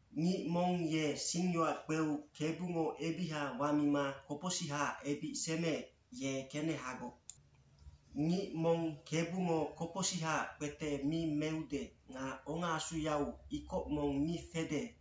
aNgic mong ye singyoac kpeu Kebungo ebiha wamima kopocsihaac ebic semeec, ye kenehagoc. Ngic mong Kebungo kopocsihaac kpete mi meude nga ongaasuyau ikoc mong mi fede,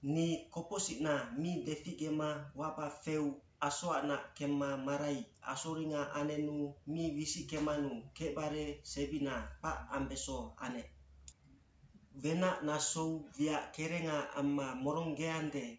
Ni kopocsicna mi deficgema waba feu asoacnac kemma marai asoringa anenu mi wisickemanu kecbare sebina kpac ambeso anec. Wenac nasou wiac kerenga amma moronggeande,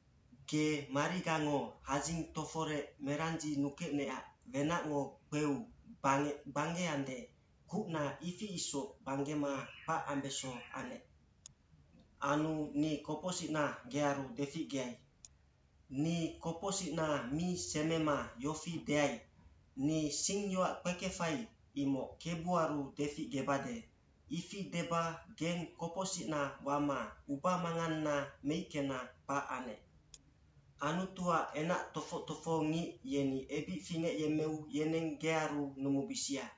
Ge marigango hadzing toforec merandzinukecnecac wenacngo kpeu bangec gbanggeande, kucna ifi isoc gbanggema kpac ambeso anec. Anu ni kopocsicna gearu deficgeai. Ni kopocsicna mi semema yofi deai, “Ni singyoac kpekefai, imoc kebuaru deficgebade.” ifi deba geng kopocsicna wama ubamanganna meickena kpac anec. Anutuac enac tofoc tofohongic yeni ebic fingecyemmeu yeneng gearu numubisia.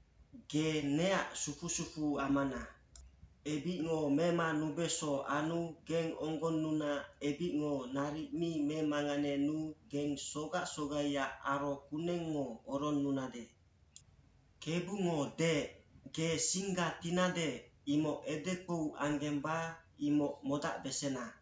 Ge neac sufu sufuamana. Ebicngo memanubeso anu geng onggonnuna ebicngo naric mi memanganenuu geng sogac sogaiac aro kunengngo oronnunade. Kebungo deec, “Ge singga tinade, imoc edekpou anggemba, imoc modacbesena.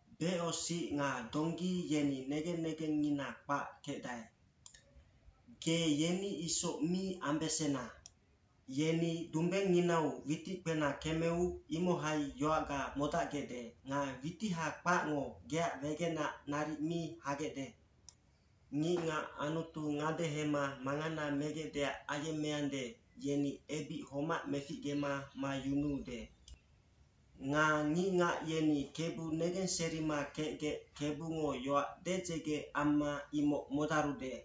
Becosic nga donggi yeni negen negengngina kpac kecdae. Ge yeni isoc mi ambesena. Yeni dumbengnginau witic kpena kemeu, imohai yoacga modacgecde nga witiha kpacngo geac wegenac naric mi hagecde.” Ngicngac Anutu ngadehema mangana megecdeac ayemmeande, yeni ebic homac meficgema mayunuude. Nga ngicngac yeni Kebu negenserima kecgec Kebungo yoac dedzege amma imoc modarude.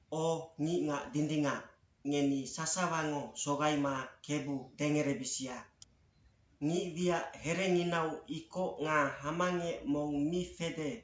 O ngicngac dindingac, ngeni sasawango sogaima Kebu dengerebisia. Ngicwiac herenginau ikoc nga hamangec mong mi fede,